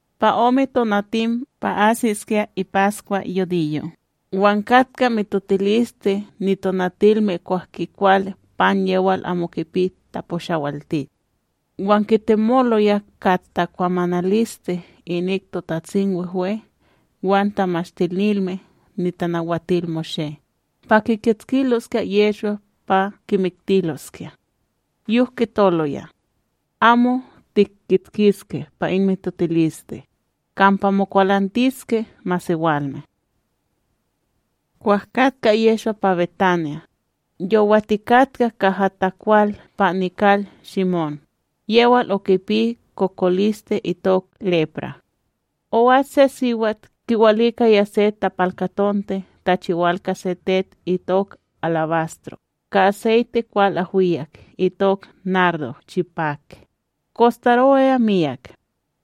Pa ome tonatim pa asiskya ipaskwa yudiyo' wan katka mitotiliste nitonatilme kwah kikwal pan yewal amo kipi taposhawalti. Wan kitemoloya ka tekwamanaliste inik TotatsimWehwe wan Tamashtinilme NitanawatilMoshé pa kikitskiloskya Yehshwa pa kimiktiloskya. Yok kitoloya: ―Amo tihkitskiske pa in mitotiliste, kampa mokwalantiske masewalme. Kwah katka Yehshwa pa BetAnya, yowatikatka kaha takwal pa nikal Shimón yewal okipi kokoliste itok lepra; o'as se siwat kiwalikaya se tapalkatonte tachiwal ka se tet itok alabastro ka aseyte kwal ahwiyak itok nardo chipak, kostarowaya miyak.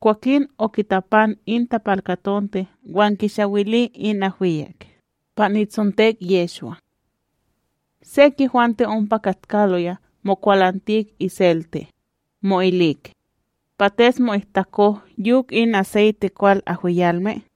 Kwakin okitapan in tapalkatonte wan kishawili in ahwiyak pa nitsontek Yehshwa. Sek yehwante ompa katkaloya mokwalantik iseltek, mo'ilik: ―Pates mo'ihtako yok in aseyte kwal ahwiyalme?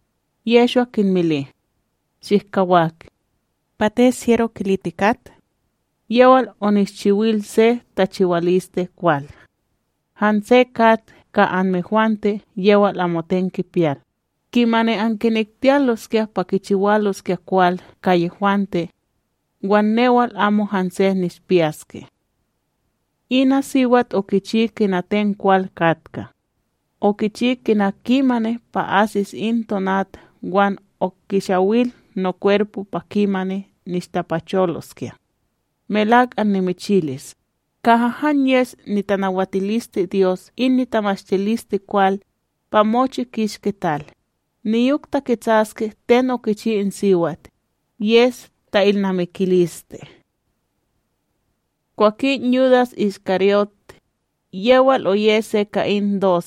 Yehshwa kinmili: ―Shihkawak; pates hyero kilitikat? Yewal onishchiwil se tachiwaliste kwal. Hanse kat ka anmehwante yewal amoten kipiyal, kimani ankinektiyaloskya pa kichiwaloskya kwal ka yehwante; wan newal amo hanse nishpiyaske. Ina siwat okichi kina ten kwal katka; okichi kina kimani pa asis in tonat wan okishawil nokwerpo pa kimani nishtapacholoskya. Melak annimichilis, kaha han yes nitanawatilisteDyos in nitamashtilisteKwal, pa mochi kishki tal, niyok taketsaske ten okichi in siwat, yes ta'ilnamikiliste. Kwakin Yudas IshKaryót, yewal oye se ka in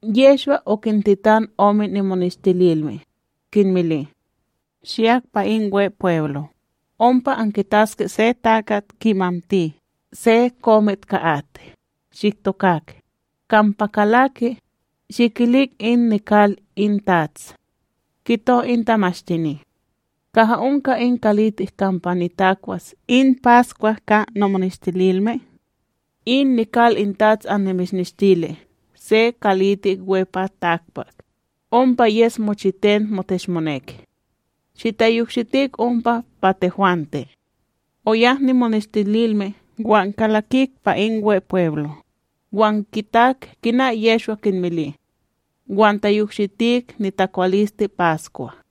Yehshwa okintetan ome nimoneshtililme, kinmili: ―Shiyak pa in Wepweblo, ompa ankitaske se takat kimamti se komit ka at. Shiktokak, kampa kalaki, shikilik in nikal in tats: “Kito in tamashtini: Kaha onka in kalitik kampa nitakwas in paskwa ka nomoneshtililme?” In nikal in tats anmishnishtili se kalitik we pa takpak, ompa yes mochiten moteshmonek; shitayokshitik ompa pa tehwante. Oyak nimoneshtililme wan kalakik pa in Wepweblo, wan kitak kina Yehshwa kinmili; wan tayokshitik nitakwaliste paskwa.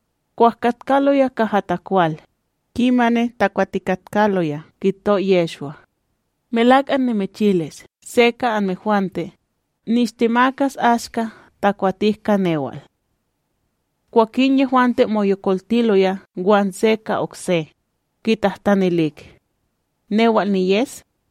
Kwah katkaloya kaha takwal, kimani takwatikatkaloya kito Yehshwa: ―Melak annimichilis se ka anmehwante, nishtemakas ashka takwatik ka newal. Kwakin yehwante moyokoltiloya wan se ka okse, kitahtanilik: ―Newal niyes?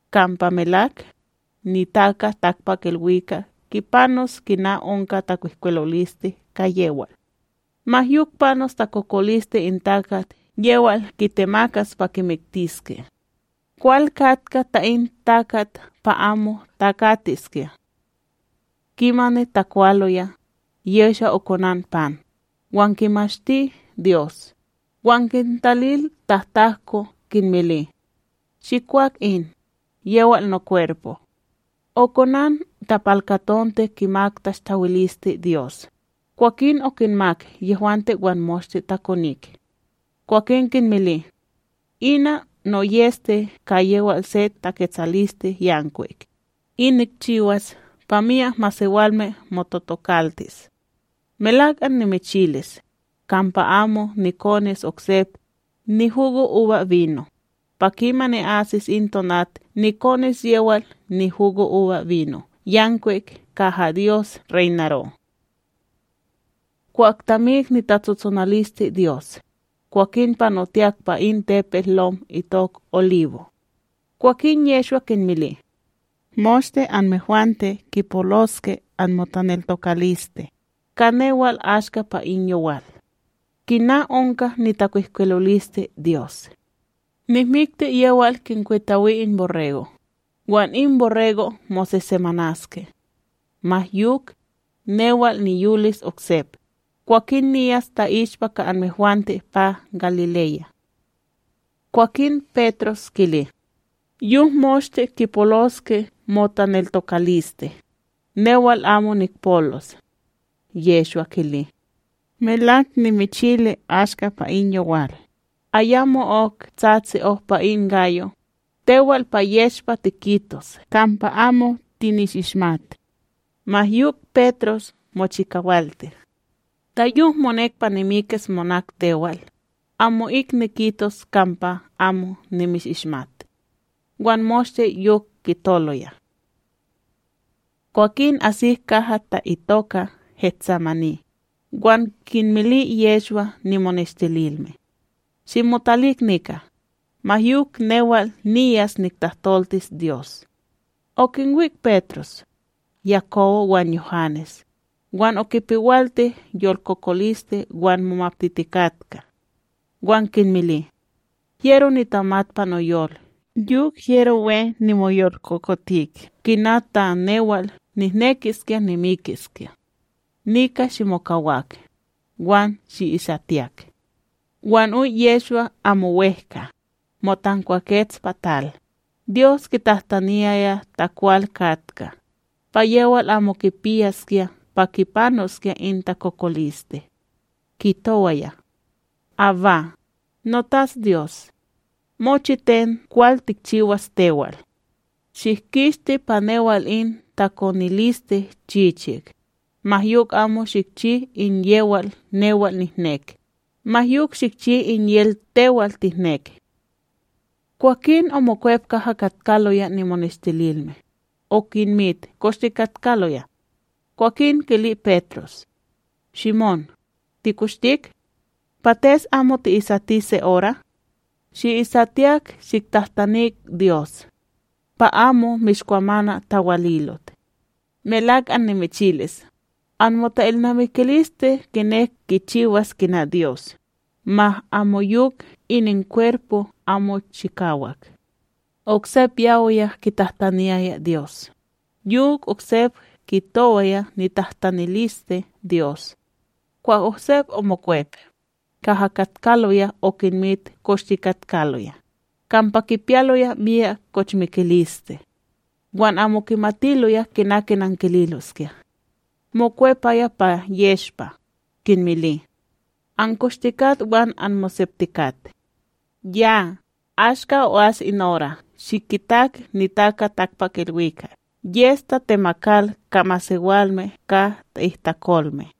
Kampa melak, NitakaTakpakIlwikak kipanos kina onka takwihkwiloliste ka yewal; ma yok panos takokoliste in takat yewal kitemakas pa kimiktiske! Kwal katka ta in takat pa amo takatiskya. Kimani takwaloya, Yehshwa okonan pan, wan kimashti Dyos, wan kintalil tahtahko, kinmili: ―Shikwak in, yewal nokwerpo. Okonan tapalkatonte kimak tashtawiliste Dyos, kwakin okinmak yehwante wan moshte takonik. Kwakin kinmili: ―Ina noyEste ka yewal se taketsalisteYankwikb, in nikchiwas pa myak masewalme mototokaltis. Melak annimichilis, kampa amo nikonis oksep nihugoUbaBino, pa kimani asis in tonat nikonis yewal nihugoUbaBino yankwik kaha Dyos reynaro. Kwah tamik nitatsotsonaliste Dyos, kwakin panotiyak pa in tepetLom itok Oliwo'. Kwakin Yehshwa kinmili: ―Moshte anmehwante kipoloske anmotaneltokaliste ka newal ashka pa in yowal; kina onka nitakwihkwilolisteDyos: “Nihmikti yewal kinkwitawi in borrego', wan in borrego' mosesemanaske.” Ma yok, newal niyolis oksep, kwakin niyas ta'ishpa ka anmehwante pa Galileya. Kwakin Petros kili: ―Yok moshte kipoloske motaneltokaliste, newal amo nikpolos. Yehshwa kili: ―Melak nimichili ashka pa in yowal, ayamo'ok tsatsi ohpa in gayo, tewal pa yeshpa tikitos kampa amo tinishishmat. Ma yok Petros mochikawalti: ―Ta yok monek pa nimikis monak tewal, amo'ik nikitos kampa amo nimishishmat. Wan moshte yok kitoloya. Kwakin asik kaha ta'itoka GetSemani, wan kinmili Yehshwa nimoneshtililme: ―Shimotalik nika, ma yok newal niyas niktahtoltis Dyos. Okinwik Petros, Yakobo wan Yuhanes, wan okipewalti yolkokoliste wan momaptitikatka. Wan kinmili: ―Hyero nitamat pa noyol yok hyero we nimoyolkokotik kina ta newal nihnekiskya nimikiskya. Nika shimokawak, wan shi'isatiyak. Wan oy Yehshwa amo wEhka, motankwakets pa tal, Dyos kitahtaniyaya ta kwal katka, pa yewal amo kipiyaskya pa kipanoskya in takokoliste. Kitowaya: ―Abba, noTatsDyos, mochiten kwal tikchiwas tewal; shihkishti pa newal in takoniliste chichik, ma yok amo shikchi in yewal newal nihnek, ma yok shikchi in yewal tewal tihnek. Kwakin omokwep kaha katkaloya nimoneshtililme, okinmit koshtikatkaloya; kwakin kili Petros: ―Shimón, tikoshtik? Pates amo oti'isati se ora? Shi'isatiyak shiktahtanik Dyos, pa amo mishkwamana tawalilot. Melak annimichilis, anmota'ilnamikiliste kinek kichiwas kina Dyos, ma amoyok ininkwerpo amo chikawak. Oksep yawiya kitahtaniyaya Dyos, yok oksep kitowaya nitahtaniliste Dyos. Kwah oksep omokwep, kaha katkaloya okinmit koshtikatkaloya, kampa kipiyaloya miyak kochmikiliste. Wan amo kimatiloya kina kinankililoskya. Mokwepaya pa yeshpa, kinmili: ―Ankoshtikat wan anmoseptikat. Yaaa, ashka o'as in ora shikitak NitakaTakpakIlwikak yes tatemakal ka masewalme ka ta'ihtakolme.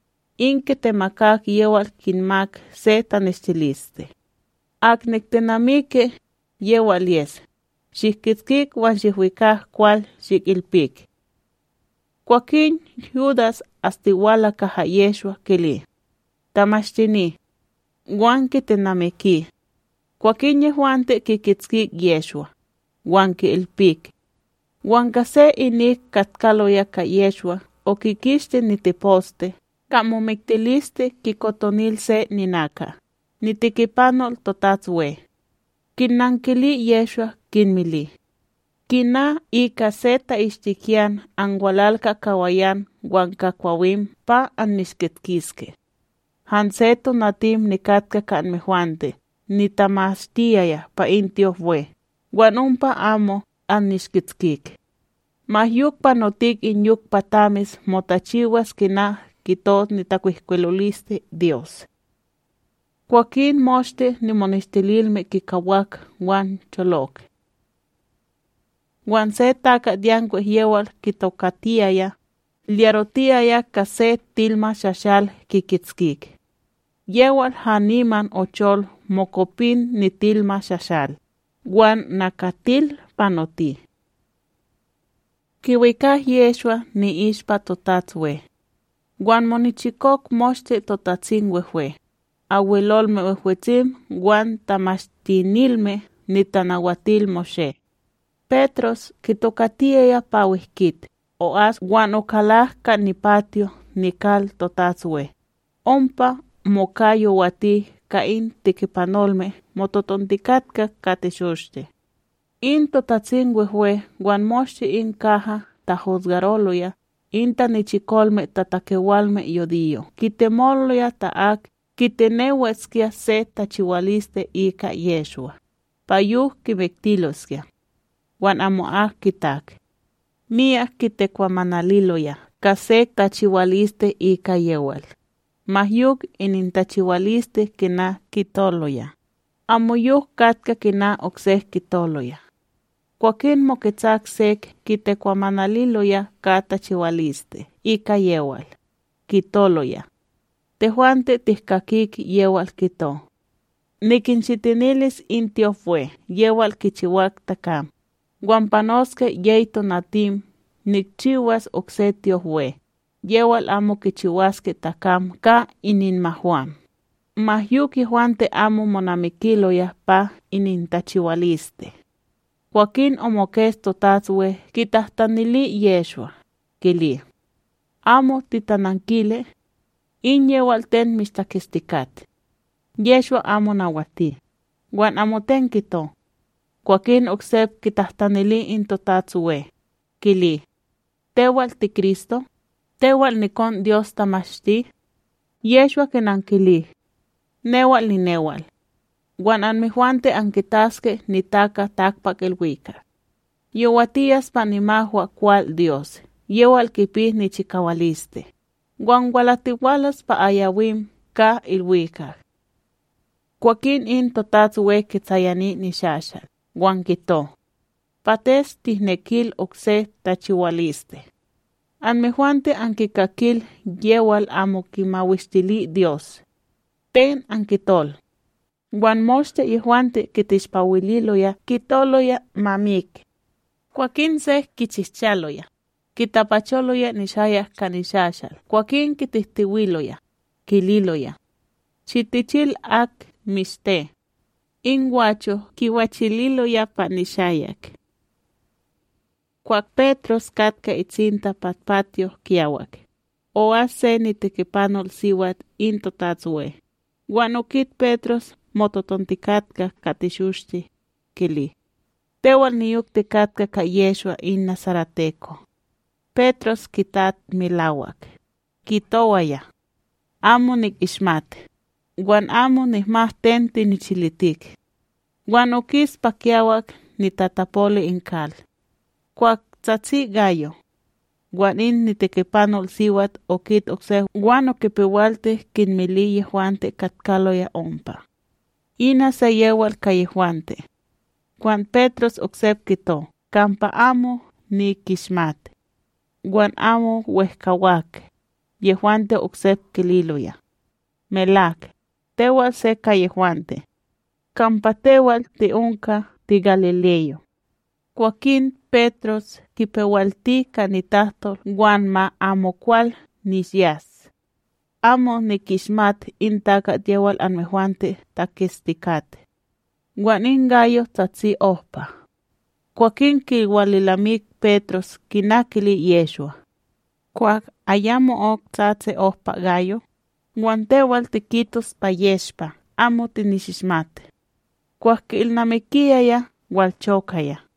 In kitemak yewal kinmak se taneshtiliste: ―Ak niktenamiki, yewal yes; shihkitskik wan shihwikak kwal shihilpik. Kwakin Yudas astiwalaya kaha Yehshwa kili: ―Tamashtini. Wan kitenamiki. Kwakin yehwante kikitskik Yehshwa, wan ki'ilpik. Wan se ka inik katkaloya ka Yehshwa okikishti niteposte ka momiktiliste kikotonil se ninaka nitikipanol TotatsWe. Kinnankili Yehshwa kinmili: ―Kina ika se ta'ishtikiyan anwalal ka kawayan wan ka kwawim pa annishkitskiske? Hanse tonatim nikatka ka anmehwante nitamashtiyaya pa in tyopWe, wan ompa amo annishkitskik. Ma yok panotik in yok pa tamis motachiwas kina kito nitakwihkwilolisteDyos. Kwakin moshte nimoneshtililme kikawak wan cholok. Wan se takatYankwik yewal kitokatiyaya, liyarotiyaya ka se tilmaShashal, kikitskik; yewal haniman ochol mokopin nitilmaShashal, wan nakatil panoti. Kiwikak Yehshwa ni'ishpa TotatsWe; wan monichikok moshte TotatsimWehwe, Abwelolme Wehwetsim wan Tamashtinilme NitanawatilMoshé. Petros kitokatiyaya pa wEhkit o'as wan okalak ka nipatyo nikal TotatsWe, ompa moka yowati ka in tikipanolme mototontikatka ka teshoshte. In TotatsimWehwe wan moshte in kaha tahosgaroloya in tanichikolme tatakewalme yudiyo' kitemoloya ta ak kitenewaskya se tachiwaliste ika Yehshwa, pa yok kimiktiloskya; wan amo kitak. Myak kitekwamanaliloya ka sek tachiwaliste ika yewal, ma yok inintachiwaliste kina kitoloya amoyok katka kina oksek kitoloya. Kwakin moketsak sek kitekwamanaliloya ka tachiwaliste ika yewal, kitoloya: ―Tehwante tihkakik yewal kito: “Nikinshitinilis in tyopWe yewal kichiwak takam, wan panoske yey tonatim nikchiwas okse tyopWe yewal amo kichiwaske takam ka ininmahwam.” Ma yok yehwante amo monamikiloya pa inintachiwaliste. Kwakin omokets TotatsWe kitahtanili Yehshwa, kili: ―Amo titanankili? In yewal ten mishtaketstikat? Yehshwa amo nawati, wan amoten kito. Kwakin oksep kitahtanili in TotatsWe, kili: ―Tewal tiKristo, Tewal nikonDyos tamashti? Yehshwa kinankili: ―Newal ninewal. Wan anmehwante ankitaske NitakaTakpakIlwikak yowatiyas pa nimahwakwalDyos yewal kipi nichikawaliste, wan walatiwalas pa ayawim ka ilwikak. Kwakin in TotatsWe kitsayani nishashalc, wan kito: Pates tihnekil oksek tachiwaliste? Anmehwante ankikakil yewal amo kimawishtiliDyos; ten ankitol? Wan moshte yehwante kiteshpawililoya kitoloya ma mik. Kwakin sek kichihchaloya, kitapacholoya nishayak ka shashal kwakin kitihtiwiloya, kililoya: ―Shitichil ak mishte! In gwacho' kiwachililoya pa nishayak. Kwah Petros katka tatsinta pa patyo kiyawak, o'as se nitikipanolSiwat in TotatsWe; wan okit Petros mototontikatka ka teshoshte, kili: ―Tewal niyok tikatka ka Yehshwa in nasareteko. Petros kitat melawak, kitowaya: ―Amo nikishmat, wan amo nihmat ten tinichilitik. Wan okis pa kiyawak nitatapol in kal. Kwah tsatsi gayo. Wan in tikipanolSiwat okit oksep wan okipewalti kinmili yehwante katkaloya ompa: ―Ina se yewal ka yehwante. Wan Petros oksep kito kampa amo nikishmat. Wan amo wehkawak, yehwante oksep kililoya: ―Melak, tewal se ka yehwante; kampa tewal ti'onka, tigalileyo. Kwakin Petros kipewalti ka nitahtol wan ma amokwal nishyas: ―Amo nikishmat in takat yewal anmehwante taketstikat. Wan in gayo tsatsi ohpa. Kwakin kiwalilnamik Petros kina kili Yehshwa: “Kwah ayamo'ok tsatsi ohpa gayo, wan tewal tikitos pa yeshpa amo tinishishmat.” Kwah ki'ilnamikiyaya walchokaya.